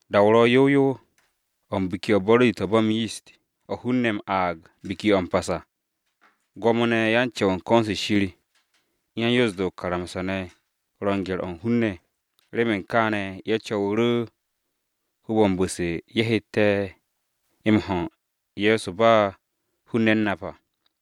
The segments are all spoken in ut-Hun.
Da-o ro̱ yow yow o̱ u̱n Biki-o̱ u̱t-Buro̱di to̱ ba m-Yist o̱ hun-ne̱ m-aag Biki-o̱ m-Pas à. Gwo̱mo-ne̱ ye̱ u̱n ko̱n-se Shir u̱n yan-Yoos-de o-karamsa ne̱ ro̱ u̱n gye̱r-o̱ u̱n hun-ne̱, remen kaane̱ ye̱ co̱wu̱ru̱ hoob-o̱ u̱n bu̱-se ye̱ hette̱ ho̱ u̱n Ye̱so ba hun-ne̱ u̱n nap à.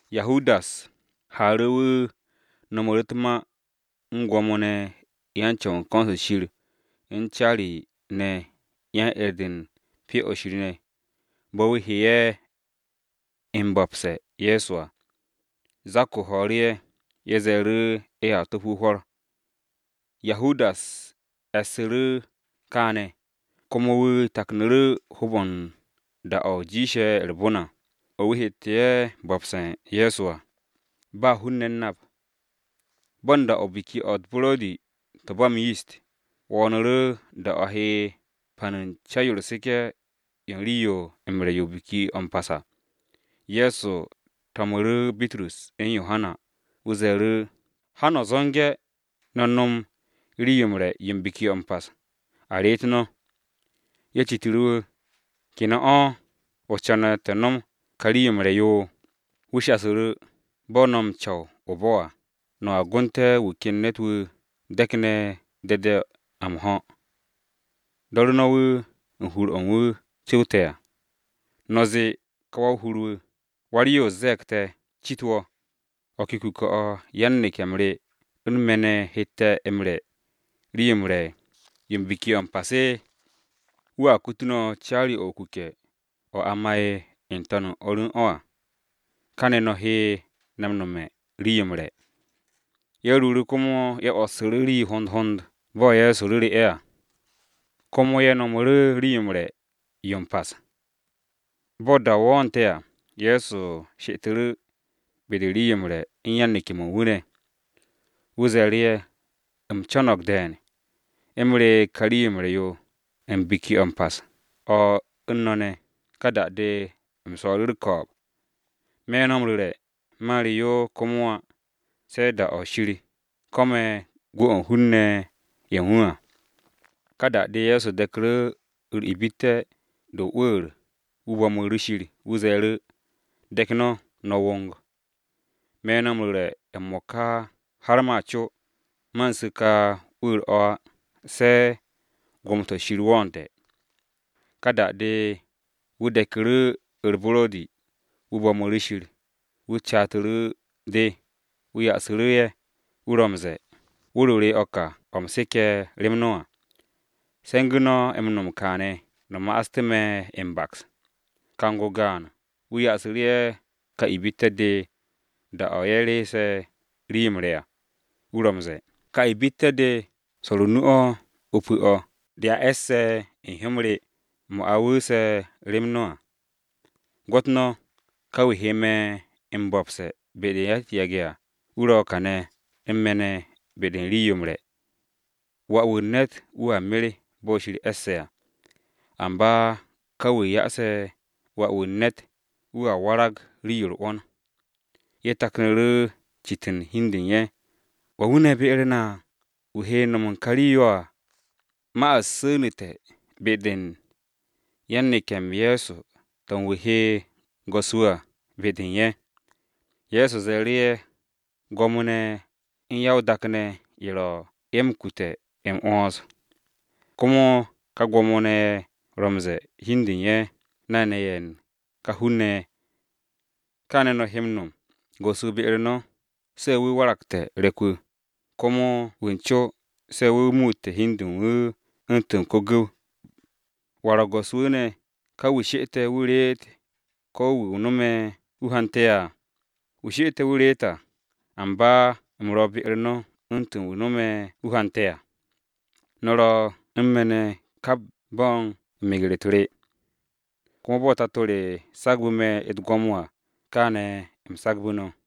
Yahudas haaru̱, wu̱ no̱mu̱ru̱ u̱t-ma u̱n Gwo̱mo-ne̱ ye̱ u̱n ko̱n-se Shir u̱n caari-ne̱ ne̱ yan-'er-de u̱n Pyo-o̱ Shir bo̱ wu̱ he ye̱ m-bo̱pse̱ u̱n Ye̱so à. Zak-o ho̱o̱ru̱ ye̱, ye̱ ze̱e̱ru̱ ye̱a top wu̱ hwo̱r. Yahudas e̱su̱ru̱ kaane̱, komo wu̱ taknu̱ru̱ hoob-o̱ u̱n da-o̱ jiishe̱ u̱r-bon à, o̱ wu̱ hette̱ ye̱ m-bo̱pse̱ u̱n Ye̱so à, ba hun-ne̱ u̱n nap. Da-o̱ u̱n Biki-o̱ u̱t-Buro̱di to̱ ba m-Yist wo̱o̱nu̱ru̱ da-o̱ a he pan u̱n ca-yo u̱r-seke̱ yo u̱n rii-yo m-re̱ yo Biki-o̱ m-Pas à. Ye̱so to̱mu̱ru̱ Bitrus u̱n Yohana, wu̱ ze̱e̱ru̱, “Ha no̱ zo̱nge̱ no̱ nom rii-yo m-re̱ yo u̱n Biki-o̱ m-Pas a reet no̱!” Ye̱ citu̱ru̱ wu̱, “¿Ke ne̱ o̱, o co̱ne̱ te̱ nom ka rii-yo m-re̱ yo?” Wu̱ shasu̱ru̱, “Bo̱ no̱ m-co̱w o-bo̱ à, no̱a gonte̱ wu̱ ken ne̱t-wu̱ de̱kne̱ de̱de̱-o̱ m-ho̱ à. Do̱ru̱ no̱ wu̱ u̱n hur-o̱ wu̱ cu̱wte̱ à. No̱ zee ka wa-o-hur wu̱: ‘Wa-u̱r-Yoos ze̱e̱g te̱ cit wo̱, ¿o̱ ke kuke̱-o̱ yan-neke̱-m re u̱n me̱ ne̱ hette̱ m-re̱ rii-yo m-re̱ yo u̱n Biki-o̱ m-Pas?’ Wu̱a kutu no̱ caari-o̱ o-kuke̱ o̱ a ma'e̱ n-to̱n u̱n o̱r u̱n o̱ à, kane̱ no̱ he na no̱me̱ u̱n rii-yo m-re̱.” Ye̱ ruuru̱ komo ye̱ 'wo̱ssu̱ru̱ rii hond hond bo̱ Ye̱so ru̱ru̱ ye̱ à. Komo ye̱ no̱mu̱ru̱ rii-yo m-re̱ yo Biki-o̱ m-Pas. Bo̱ da-o wo̱o̱nte̱ à, Ye̱so she'etu̱ru̱ be-de u̱n re̱ rii-yo m-re̱ u̱n yan-to̱m-ye̱ u̱n wu̱ ne̱. Wu̱ ze̱e̱ru̱ ye̱, “U̱m co̱no̱g de̱e̱n, u̱m re ka rii-yo m-re̱ yo u̱n Biki-o̱ m-Pas o̱ u̱n no̱ ne̱, ka da-de u̱m swo̱o̱ru̱ u̱r-ko̱o̱b! Me̱ no̱ m-ru̱re̱, man re yo komo á, se̱ da-o Shir ko̱me̱ gwu̱-o̱ u̱n hun-ne̱ ye̱ u̱n wu̱ à.” Ka da-de Ye̱so de̱ku̱ru̱ u̱r-ibitte̱ de m-mo̱di, wu̱ bo̱mu̱ru̱ Shir. Wu̱ ze̱e̱ru̱, “De̱k no̱, no̱ wong. Me̱ no̱ m-ru̱re̱ m-mo̱ka har ma co, man su̱ ka 'wu̱u̱r-o̱ á, se̱ gwo̱mo-to̱ Shir wo̱o̱nte̱.” Ka da-de wu̱ de̱ku̱ru̱ u̱r-buro̱di wu̱ bo̱mu̱ru̱ Shir, wu̱ catu̱ru̱ de. Wu̱ ya'su̱ru̱ ye̱, wu̱ ro̱ m-ze̱e̱, “Wu̱r-o re o̱ ka o̱ u̱m seke̱, rem no̱ à. Se̱ngu̱ no̱ m-no̱m kaane̱ no̱ ma'aste̱ me̱ m-baks.” Kang-o gaan, wu̱ yasu̱ ye̱ ka ibitte̱-de da-o̱ ye̱ reese̱ rii-yo m-re̱ à. Wu̱ ro̱ m-ze̱e̱, “Ka ibitte̱-de swo̱r o-nu o̱ o-pu̱ o̱ dea e̱s u̱n hyó-m re, mo̱ a wu̱u̱se̱ rem no̱ à. “Gwo̱t no̱! Ka wu̱ he me̱ m-bo̱pse̱ be-de ya-u̱t-yage̱ à, wu̱ ro̱ kane̱ u̱n me̱ ne̱ be-de u̱n rii-yo m-re̱! Wà-wu̱ u̱n ne̱t wu̱a mer bo̱ Shir e̱sse̱ à. Amba ka wu̱ yase̱ Wà-wu̱ u̱n ne̱t, wu̱a warag rii-yo u̱r-'wo̱n!” Ye̱ taknu̱ru̱ citu̱n hi u̱n de u̱n ye̱, “¿Wan wu̱ ne̱ be-u̱r na, wu̱ he no̱m u̱n ka rii-yo à?” Ma-u̱t su̱nu̱te̱ be-de u̱n yan-neke̱-m Ye̱so, to̱ u̱n wu̱ he go̱s-wu̱ à, be-de u̱n ye̱. Ye̱so ze̱e̱ru̱ ye̱, “Gwo̱mo-ne̱ ye̱ u̱n ya-o-dak, ye̱ ro̱ ye̱ m-kute̱ m-'wo̱ns. Komo ka gwo̱mo-ne̱ ye̱ ro̱ m-ze̱e̱ u̱n hi u̱n de u̱n ye̱, ‘Nay-ne̱ ye̱ u̱n ka hun-ne̱ ye̱.’ Kaane̱ no̱ he m-nom, go̱s-wu̱ be-u̱r no̱, se̱ wu̱ waragte̱ re̱k-wu̱, komo wa u̱n co, se̱ wu̱ muute̱ hi u̱n de u̱n wu̱ u̱ntu̱n ko-gu̱w. ¿Wa ro̱ go̱s-wu̱ ne̱, ka wu̱ she'ete̱ wu̱ reete̱, ko wu̱ no̱me̱ wu̱ hante̱ à? Wu̱ she'ette̱ wu̱ reet à. Amba u̱m ro̱ be-u̱r no̱ u̱ntu̱n wu̱ no̱me̱ wu̱ hante̱ à. “No̱ ro̱ u̱n me̱ ne̱ kap bo̱ u̱n meger-u̱t re. Komo bo̱ Tato re sagbu̱ me̱ u̱t-gwo̱mo à, kaane̱ u̱m sagbu̱ no̱.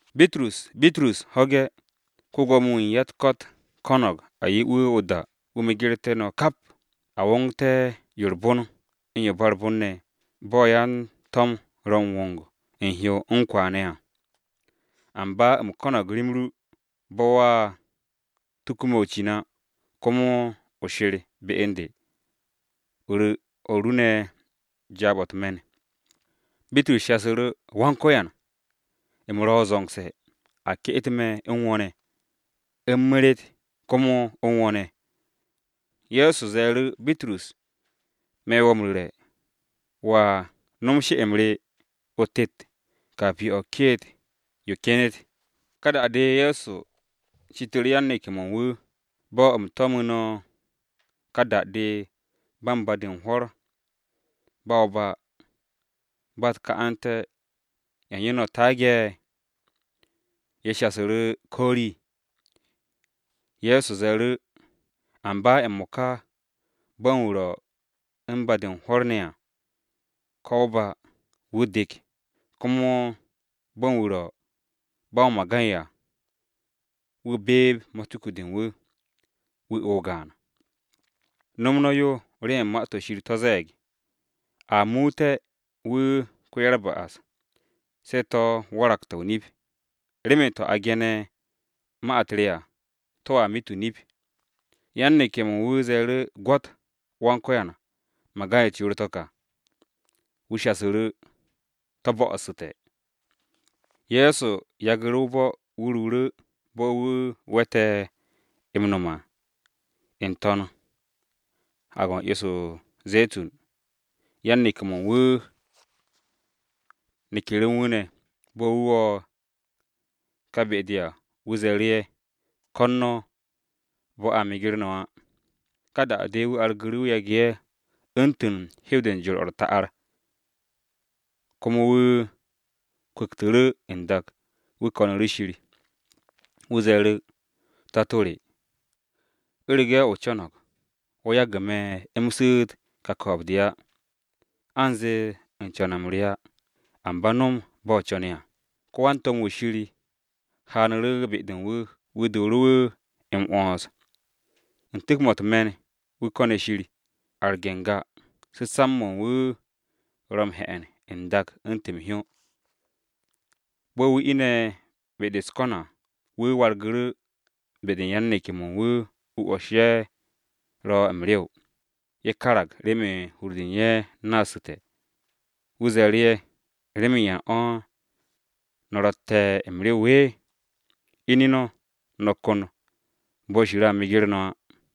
“Bitrus, Bitrus! Ho̱ge̱! Ko-Gwo̱mo-wu̱ u̱n ya-u̱t-ko̱t ko̱no̱g a 'ye wu̱ o-da wu̱ megertu̱ no̱ kap, a wongte̱ yo u̱r-bon, u̱n yo ba u̱r-bon ne̱, bo̱ ya-to̱m ro̱ u̱n wong u̱n hyo u̱n kwa ne̱ à. Amba u̱m ko̱no̱g rem ru, bo̱ wo̱a tuku me̱ o-cin á. Komo o she̱r be u̱n de, o ru̱ o̱r ru ne̱ jaab-o̱ u̱t-me̱n.” Bitrus shasu̱ru̱, “Go̱s-wu̱, u̱m ro̱ zo̱ngse̱ a ke'et me̱ u̱n wo̱ ne̱, u̱m meret komo u̱n wo̱ ne̱!” Ye̱so ze̱e̱ru̱, “Bitrus, me̱ wo̱ m-ru̱re̱, wo̱a no̱m she'-m re o-tet rii-o̱ ke̱e̱g-yo o-kiit kenet.” Ka da-de Ye̱so citu̱ru̱ yan-neke̱-mo̱ u̱n wu̱. “Bo̱ u̱m tomu̱ no̱ ka da-de ba u̱n ba-de u̱n hwo̱r, ba o-ba, ba u̱t-ka'ante̱, ¿ya u̱n yo no̱ taage̱?” Ye̱ shasu̱ru̱, “Ko rii.” Ye̱so ze̱e̱ru̱, “Amba m-mo̱ka, bo̱ u̱n wu̱ ro̱ u̱n ba-de u̱n hwo̱r ne̱ à, ko o-ba, wu̱ dek, komo bo̱ u̱n wu̱ ro̱ ba o-magay à wu̱ beeb matuku-de u̱n wu̱, wu̱ o o-gaan. No̱m no̱ yo, remen Ma-to̱ Shir to̱ ze̱e̱g, ‘A muut wu̱ ko-ya-u̱r-ba'as,’ se̱ to̱ waragte̱ o-nip, remen to̱ a ge̱ne̱ u̱t-ma re à to̱a mit o-nip.” Yan-neke̱-mo̱ u̱n wu̱ ze̱e̱ru̱, “Gwo̱t! Go̱s-wu̱, magay-u̱t yoor-to̱ ka!” Wu̱ shasu̱ru̱, “To̱ bo̱'o̱su̱te̱!” Ye̱so yagu̱ru̱ o-bo̱ wu̱ ruuru̱, bo̱ wu̱ we̱te̱ m-nom à, n-to̱n Haag-o̱ u̱n 'yo-se o-Ze̱tun, yan-neke̱-mo̱ u̱n wu̱ neku̱ru̱ u̱n wu̱ ne̱. Bo̱ wu̱ wo̱ ka be-de à, wu̱ ze̱e̱ru̱ ye̱, “Ko̱n no̱ bo̱ a meger no̱ á.” Ka da-de wu̱ argu̱ru̱ wu̱ yage̱ ye̱ u̱ntu̱n hew-de u̱n jor-o̱ u̱r-ta'ar, komo wu̱ kwu̱ktu̱ru̱ n-dak, wu̱ ko̱nu̱ru̱ Shir. Wu̱ ze̱e̱ru̱, “Tato re, u̱rege̱ o co̱no̱g, wo̱ yage̱ me̱ m-su̱u̱t ka ko̱o̱b-de á. Anze u̱n co̱n-m re á, amba no̱m bo̱ o co̱ne̱ à.” Ko wan-to̱m-wu̱ Shir haanu̱ru̱ be-de u̱n wu̱, wu̱ dooru̱ wu̱ m-'wo̱ns. U̱n tu̱k-mo̱ u̱t-me̱n, wu̱ ko̱ne̱ Shir arge̱ n-ga, su̱samb-mo̱ u̱n wu̱ ro̱ m-he̱'e̱n n-dak u̱ntu̱n m-hyó. Bo̱ wu̱ ine̱ be-de u̱s-ko̱n à, wu̱ wargu̱ru̱ be-de u̱n yan-neke̱-mo̱ u̱n wu̱. Wu̱ 'wo̱s ye̱ ro̱ m-rew, ye̱ karag remen hur-de u̱n ye̱ naasu̱te̱. Wu̱ ze̱e̱ru̱ ye̱, “¿Remen yan o̱ no̱ ro̱tte̱ m-rew? Ine̱ no̱, no̱ ko̱n Shir bo̱ a meger no̱ á.”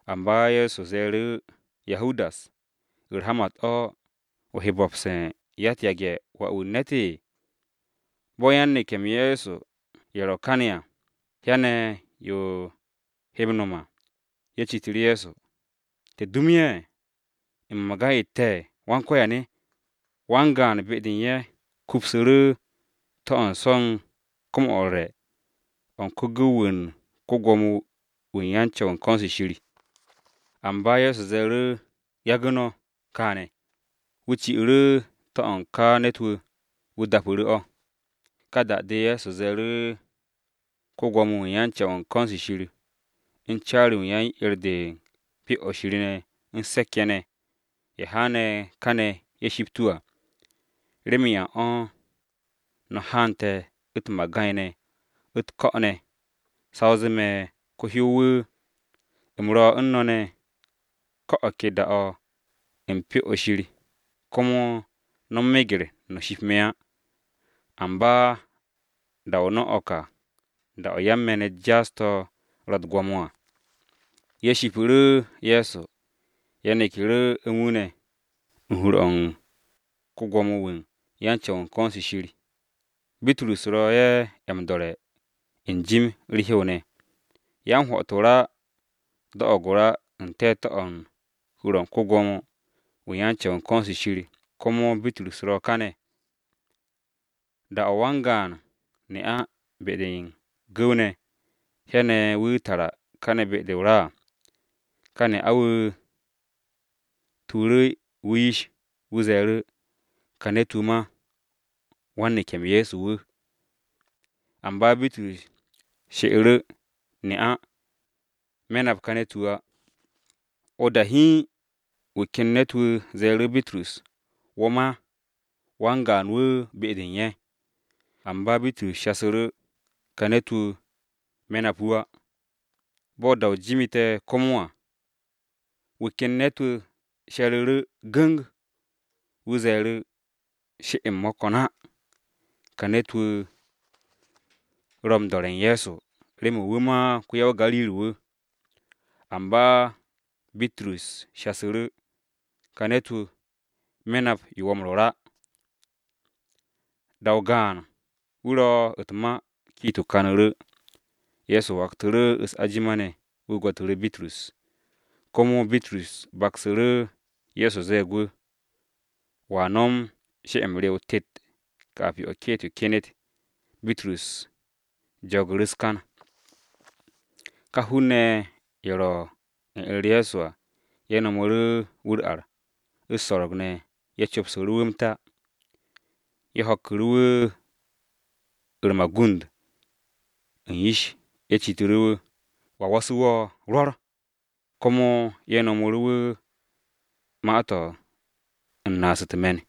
Amba Ye̱so ze̱e̱ru̱, “Yahudas, ¿u̱r-hamat o̱, o he bo̱pse̱ u̱n ya-u̱t-yage̱ Wà-wu̱ u̱n ne̱t?” Bo̱ yan-neke̱-m Ye̱so ye̱ ro kane̱ à, hyane̱ yo he m-no̱m à, ye̱ citu̱ru̱ Ye̱so, “Go̱s-wu̱, ¿te̱ dum u̱n ye̱ ne̱ u̱n magay-u̱t te̱?” Wan-gaan be-de u̱n ye̱, kupsu̱ru̱ to̱-o̱ u̱n so̱ u̱n kom-o̱ u̱r-re̱ o̱ u̱n ko-gu̱w-wu̱ u̱n ko-Gwo̱mo-wu̱ u̱n ko̱n-se Shir. Amba Ye̱so ze̱e̱ru̱, “Yagu̱ no̱ kaane̱!” Wu̱ ci'u̱ru̱ to̱-o̱ u̱n ka ne̱t-wu̱, wu̱ dapu̱ru̱ o̱. Ka da-de Ye̱so ze̱e̱ru̱ ko-Gwo̱mo-wu̱ u̱n ko̱n-se Shir, u̱n caari-wu̱ u̱n yan-'er-de u̱n Pyo-o̱ Shir ne̱ u̱n se̱k-ye̱ ne̱, ye̱ haane̱ kane̱ ye̱ shipt wu̱ à. “¿Remen yan o̱ no̱ haante̱ u̱t-magay ne̱, u̱t-ko̱ ne̱, sa o zee me̱ ko-hyow-wu̱? U̱m ro u̱n no̱ ne̱, ko̱ o̱ ke da-o̱ u̱n Pyo-o̱ Shir, komo no̱ meger no̱ shipt me̱ á. Amba da-o̱ no̱ o̱ ka da-o yan-me̱n-u̱t jaas-to̱ ro̱ u̱t-gwo̱mo à.” Ye̱ shipu̱ru̱ Ye̱so, ye̱ neku̱ru̱ u̱n wu̱ ne̱, u̱n hur-o̱ u̱n ko-Gwo̱mo-wu̱ u̱n ko̱n-se Shir, Bitrus ro̱ ye̱ m-do̱re̱ n-jim u̱r-hew ne̱. Yan-hwo̱'o̱t o-ra do̱'o̱g o-ra u̱n te̱te̱-o̱ u̱n hur-o̱ u̱n ko-Gwo̱mo-wu̱ u̱n ko̱n-se Shir, komo Bitrus ro̱ kane̱. Da-o wan-gaan ne'a be-de u̱n gu̱w-ne̱, hyane̱ wu̱ tara kane̱ be-de o-ra à. Ka ne'a-wu̱ tuuru̱ wu̱ yish. Wu̱ ze̱e̱ru̱, “Ka ne̱t-wu̱ ma wan-neke̱-m Ye̱so wu̱!” Amba Bitrus she'u̱ru̱, “Ne'a, me̱ nap ka ne̱t-wu̱ á!” O-da hiin, wu̱ ken ne̱t-wu̱ ze̱e̱ru̱ Bitrus, “Wo̱ ma wan-gaan-wu̱ be-de u̱n ye̱!” Amba Bitrus shasu̱ru̱, “Ka ne̱t-wu̱, me̱ wu̱ á!” Bo̱ da-o jimite̱ komo à. Wu̱ ken ne̱t-wu̱ she̱ru̱ru̱ gu̱ng, wu̱ ze̱e̱ru̱. “She-m mo̱ ko̱n á, ka ne̱t-wu̱ ro̱ u̱n do̱re̱ u̱n Ye̱so, remen wu̱ ma ko-ya-o-Gariri-wu̱!” Amba Bitrus shasu̱ru̱, “Ka ne̱t-wu̱, me̱ nap yo wo̱ m-rwo̱r á!” Da-o gaan, wu̱ ro̱ u̱t-ma, kiit-o kanu̱ru̱. Ye̱so waktu̱ru̱ u̱s-ajima ne̱ wu̱ gwo̱tu̱ru̱ Bitrus, komo Bitrus baksu̱ru̱ Ye̱so ze̱e̱g wu̱, “Wo̱a nom she'e-m re o-tet rii-yo o-kiit yo kenet.” Bitrus jogu̱ru̱ u̱s-kan. Ka hun-ne̱ ye̱, ye̱ ro̱ u̱n er-u̱r Ye̱so à, ye̱ no̱mu̱ru̱ wu̱ u̱r-ar, u̱s-so̱ro̱g ne̱, ye̱ co̱psu̱ru̱ wu̱ m-ta. Ye̱ ho̱kku̱ru̱ wu̱ u̱r-magund u̱n yish. Ye̱ citu̱ru̱ wu̱, “¿Wa wo̱su̱ wo̱? Rwo̱r!” Komo ye̱ nomu̱ru̱ wu̱ ma-to̱ u̱n naas u̱t-me̱n.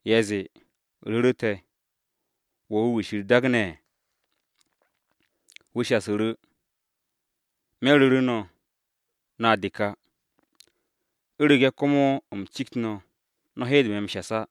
Ye̱ zee, “Ru̱ru̱te̱, ¿wo̱ ‘Kiristi’?” Wu̱ shasu̱ru̱, “Me̱ ru̱ru̱ no̱, no̱a dek á. U̱rege̱ komo u̱m cikt no̱, no̱ hede me̱ m-shas á.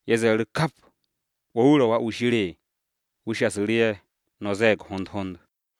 Ye̱ ze̱e̱ru̱ kap, “¿Wo̱ wu̱ ro̱, Wà-wu̱ Shir?” Wu̱ shasu̱ru̱ ye̱, “No̱ ze̱e̱g hond hond.”